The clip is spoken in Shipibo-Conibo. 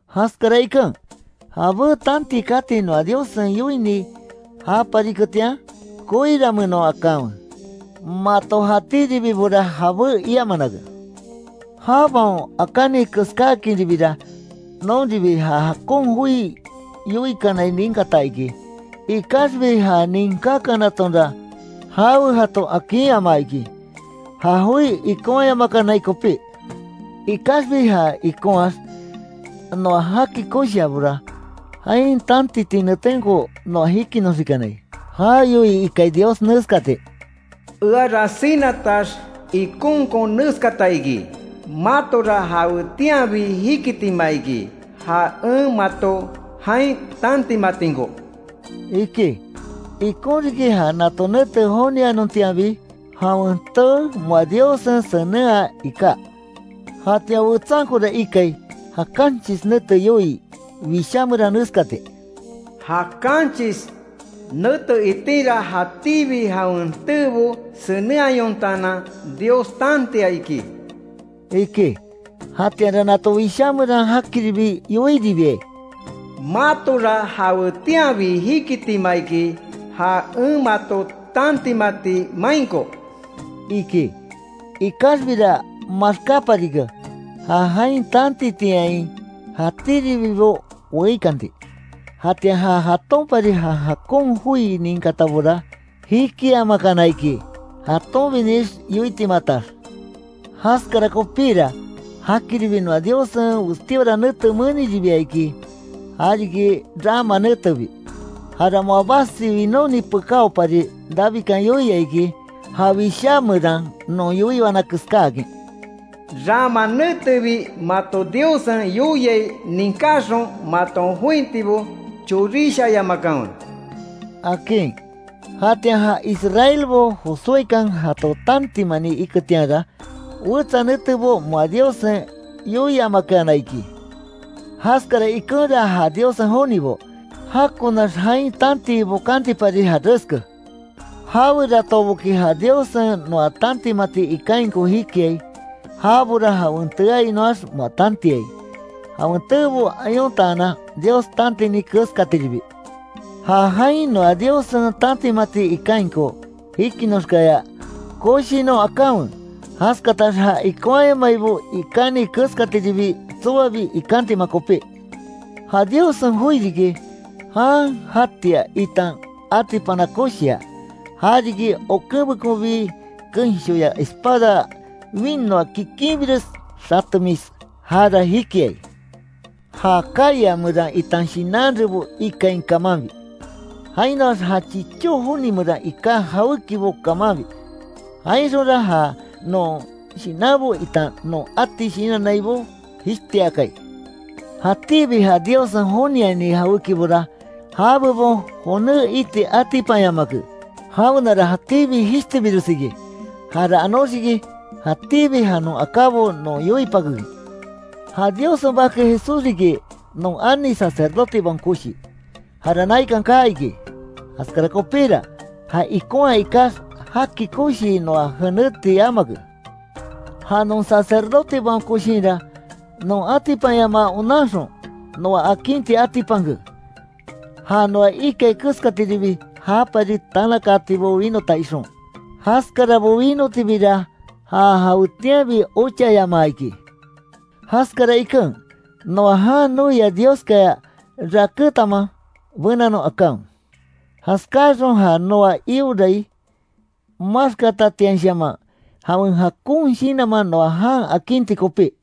Jaskara iken, jabé tantii kati noa Diossen yoini japariketian, koiranmeenon akanwe, mato jatíribibora jabé iamanake. Jabaon akáni keskáakinribira, nonribi ja jakon joi yoikanai ninkata iki, ikaxbi ja ninkákanatonra, jawe jato akinyamaa iki, ja joi ikonhayamakanai kopí. Ikaxbi ja ikonhaax, noa jaki koshiabora, jain tantiti netenko noa jikinoxikanai. Ja yoii iki iki Dios neskati: “Eara sinatax ikonkon neskata iki: matora jawetianbi jikitima iki, ja en mato jain tantimatinko”, iki. Ikon riki, ja nato nete jonianontianbi, jawen tee moa Diossen senenhaa iká, jatian wetsankora ikai, ja kanchis nete yoii Wishá meran neskati: “Ja kanchis nete itinra, jatíbi jawen teebo senenhayontaanan, Dios tantia iki”, iki. Jatianra nato Wishá meran jakiribi yoiribiai: “Matora jawetianbi jikitima iki, ja en mato tantimati mainko”, iki. Ikaxbira maxkáparike, ja jain tantitiain jatíribibo weíkanti. Jatian ja jatonpari ja jakon joi ninkatabora jikiamakana iki, jatonbinix yoitimatax. Jaskara kopíra, jakiribi noa Diossen westíora nete meniribia iki, ja riki “rama netebi”, jara moa basi winóni pekáopari, Davidkan yoia iki, ja Wishá meran non yoiwana keskáakin: “Rama netebi mato Diossen yoiai ninkáxon, maton jointibo chorishayamakanwe”, akin. Jatian ja israelbo Josuékan jato tantimani iketianra, wetsa netebo moa Diossen, yoiamakeana iki, Jaskara ikenra ja Diossen jonibo, jakonax jain tantii bokantipari jareske, jaweratoboki ja Diossen noa tantimati ikainko jikiai, jabora jawen teeainoax moa tantiai, jawen teebo ayontaanan, Dios tantini keskatiribi. Ja jain noa Diossen tantimati ikainko jikinoxkaya, koshinon akanwe, jaskatax ja ikonhayamaibo ikáni keskatiribi, tsoabi ikantima kopí. Ja Diossen joi riki, jan jatia itan atipana koshia, ja riki, okenbekonbi kenshoya espada winoa kikinbires xatemis, jara jikiai, ja kaya meran itan shinan rebo ikain kamanbi, jainoax ja chichó joni meran iká jawékibo kamanbi. Jainxonra, ja non shinanbo itan non ati shinannaibo jishtiakai. Jatíbi ja Diossen joniani jawékibora, já bebon joné iti atipanyamake, jaweara jatíbi jishtibires iki. Jara anoxiki, jatíbi ja non akábo non yoipakekin. Ja Diossen Bake Jesús riki, non ani Sacerdotebaon Koshi, jara naikan kaa iki. Jaskara kopíra, ja ikonhaa ikax, jaki koshii noa jeneti yamake. Ja non Sacerdotebaon Koshinra, non atipanyamaa onanxon, noa akinti atipanke, ja noa ikai keskatiribi jápari tanakaatibo winota ixon, jaskarabo winotibira ja jawetianbi ochayamaa iki. Jaskara iken, noa jan noia Dioskaya rakétanma benanon akanwe, jaskáaxon ja noa iorai maxkatatianshaman, jawen jakon shinanman noa jan akinti kopí.